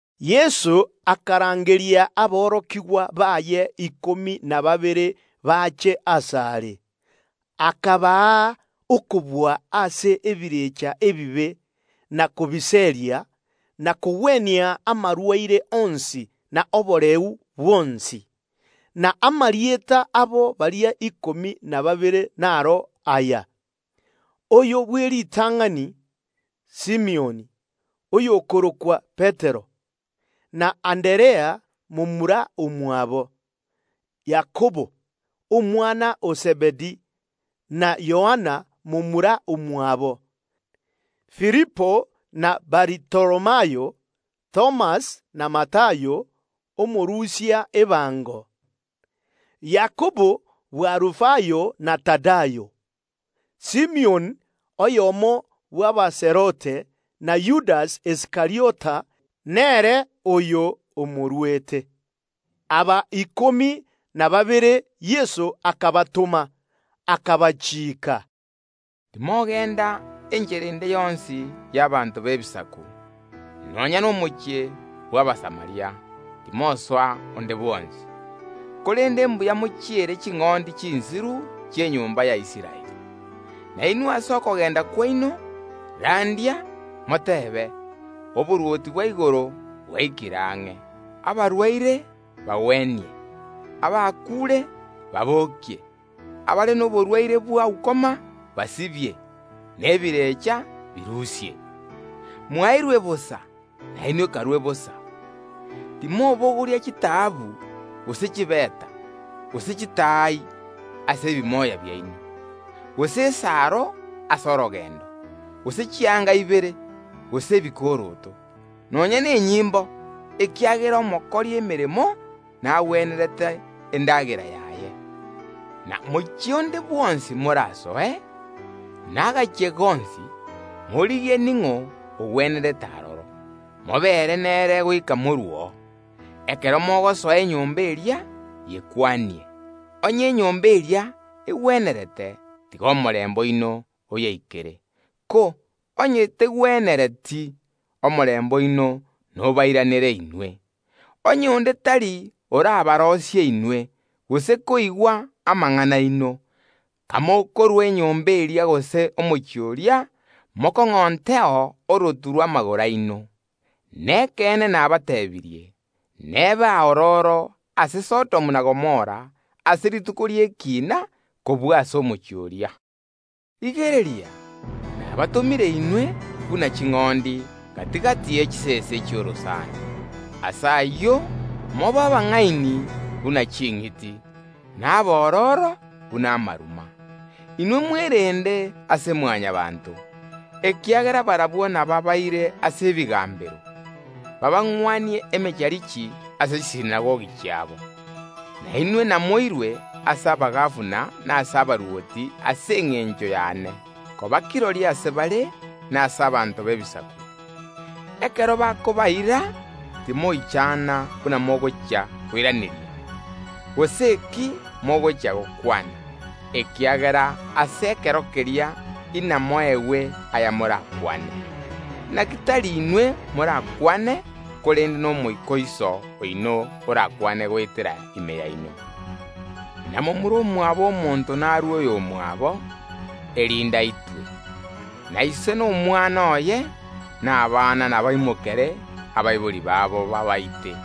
Yeso akarangeria aborokigwa baye ikomi na babere bache asare, akabaa okobua ase ebirecha ebibe na kobiseria, na kogwenia amarwaire onsi na oboreu bwonsi. Na amarieta abotomwa baria ikomi na babere naro aya: Oyo bw’eritang’ani, Simioni, oyio ore korokwa naende Petero, na Anderea momura omwabo; Yakobo, omwana o Zebedi na Yohana momura omwabo; Filipo na Batholomayo; Thomas na Matayo, omorusia ebango; Yakobo bw’Alufayo na Tadayo; Simioni omoKaanani, na Yudasi Iskariota, ere oria omoruete. Aba ikomi na babere Yeso akabatoma, akabachiika, “Timogenda enchera ende yonsi y’ abanto b’Ebisaku, timosoa nonya nomochie onde bwonsi bw’Abasamaria, korende mbuya mochiere ching’ondi chinsiru chi’enyomba ya Israeli. Na inwe ase okogenda kwaino, randia, moteebe: Oborwoti bwa igoro bwaikire ang’e. Abarwaire bagwenie, abakuure babokie, abare noborwaire bwa ukoma basibie, na ebirecha birusie. Mwaeirwe bosa, nainwe karue bosa. Timobogoria chitaabu, gose chifeta, gose chitaai ase ebimoya biaino, gose esaro ase orogendo, gose chianga ibere, gose ebikoroto, nonya nenyimbo, ekiagera omokori emeremo nagwenerete endagera yaye. Na omochie onde bwonsi morasoe, na ase ekenyoro gionsi, morigie ning’o ogwenerete aroro, mobeere nere goika moruo. Ekero mogosoa enyomba eria, yekwanie. Onye enyomba eria egwenerete, tiga omorembe oino oyeikere; ko onye tegwenereti, omorembe oino nobairanere inwe. Onye onde tari orabaroisie inwe, gose koigwa amang’ana aino, kamokorua enyomba eria gose omochie oria, orotu rw’amagoro aino morokong’ontereo. Nekeene nabateebirie: Nebe aororo ase Sodomu na Gomora ase rituko ri’ekiina kobua ase omochie oria. “Rigereria, nabatomire inwe buna ching’ondi gati‐gati ye chisese chi’orosana. Ase ayio mobe abang’aini buna ching’iti, na abororo buna amaruma. Inwe mwerende ase Mwanyabaanto, ekiagera barabwo nabaabaire ase ebigambero, babang’wanie emecharichi ase chisinagogi chiabo. Na inwe namoirwe ase abagabana na ase abarwoti ase engencho y’ane, koba kirori ase bare na ase abanto b’Ebisaku. Ekero bakobaira, timoichana buna mogochia koiraneria, gose eki mogochia gokwana, ekiagera ase ekero keria inamoegwe aya morakwane; inaki tari inwe morakwane, korende n’Omoika o Iso oino orakwane goetera ase more. Na momura omwabo omonto narue oyomwabo, erinde aitwe, na ise nomwana oye, na abana nabaimokere abaibori babo babaite,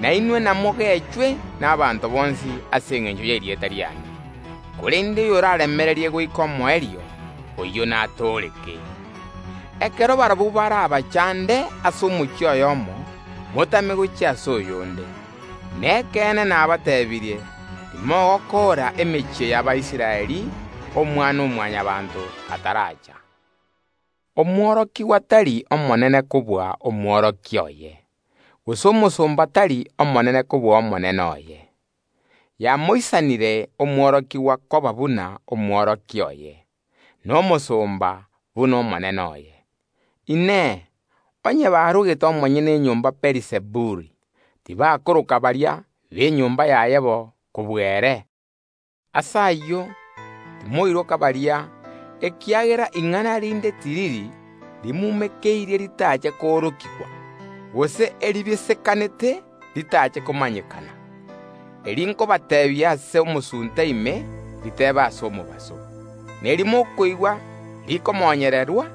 na inwe namogechwe n’abanto bonsi ase engencho y’erieta riane, korende oyoraaremererie goika omoerio, oyio natooreke. Ekero barabwo barabachande ase omochie oyomo, motame gochia ase oyonde; nekeene nabateebirie: Timogokoora emechie y’Abaisraeli Omwana-o-Mwanyabaanto ataracha. “Omworokigwa tari omonene kobua Omworokia oye, gose omosomba tari omonene kobua omonene oye. Yamoisanire omworokigwa koba buna Omworokia oye, na omosomba buna omonene oye. Inee! Onye bamorogete omonyene enyomba Beelizebuli, tibakobachecheria baria b’enyomba yaye mono komobua ere? “Ase ayio, timoiroka baria, ekiagera ing’ana rinde tiriri ribisire ritache koorokigwa, gose erikenganete ritache komanyekana. Eri nkobateebia ase omosunte ime, ritebe ase omobaso; na eri mokoigwa rikomonywa,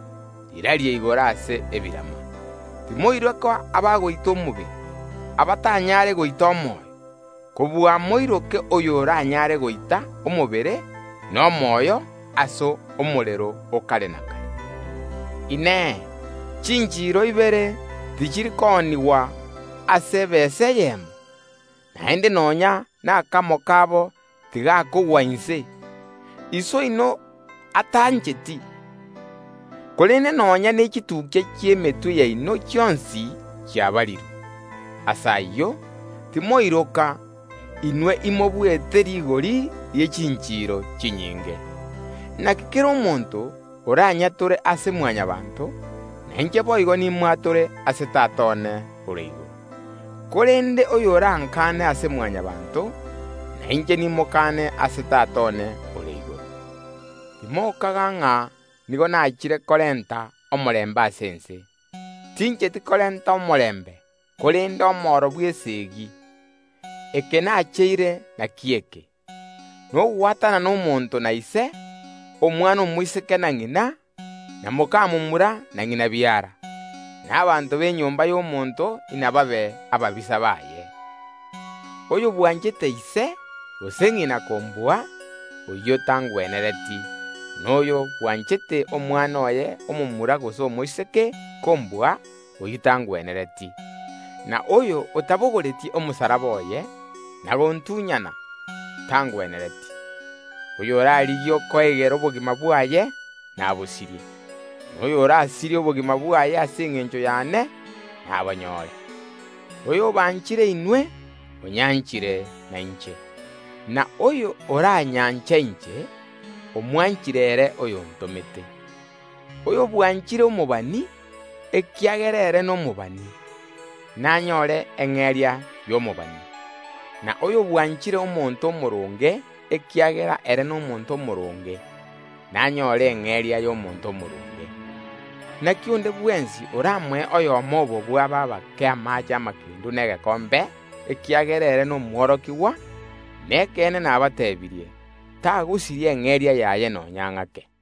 rirarie igoro ase ebirama. Timoiroka abagoita omobere, abatanyare goita omoyo; kobua moiroke oyo oranyare goita omobere na omoyo ase omorero o kare na kare. Inee! Chinchiro ibere tichiri koonigwa ase ebesa eyemo? Naende nonya nakamo kabo tigakogwa inse, Iso oino atancheti. Korende nonya nechitukia chionsi chi’emetwe yaino chiabarirwe. Ase ayio, timoiroka; inwe imobuete rigori rie chinchiro chinyinge. Inaki kera omonto oranyatore ase Mwanyabaanto, nainche boigo nimwatore ase Tata one ore igoro, korende oyorankane ase Mwanyabaanto, nainche nimokane ase Tata one ore igoro. “Timokaga ng’a nigo naachire korenta omorembe ase ense; tincheti korenta omorembe, korende omoro bw’eseegi. Eke nacheire nakio eke: nogwatanana omonto na ise, omwana omoiseke na ng’ina, na moka momura na ng’ina biara. Na abanto b’enyomba y’omonto inababe ababisa baye. Oyo bwanchete ise gose ng’ina kombua, oyio tangwenereti, na oyo bwanchete omwana oye omomura gose omoiseke kombua, oyio tangwenereti. Na oyo otabogoreti omosalaba oye na gontunyana, tangwenereti. Oyorarigie koegera obogima bwaye nabosirie, na oyorasirie obogima bwaye ase engencho y’ane nabonyore. “Oyobanchire inwe, onyanchire na inche, na oyo oranyanche inche, omwanchire ere oyontomete. Oyobwanchire omobani ekiagera ere nomobani, nanyore eng’eria y’omobani; na oyo bwanchire omonto omooronge ekiagera ere nomonto omooronge, nanyore eng’eria y’omonto omooronge. Inaki onde bwensi oramoe oyomo obo bw’aba abake egekombe kiamaache amakendu ekiagera are omworokigwa one, nekeene nabatebirie: Takoyesiria eng’eria yaye nonya ng’ake.”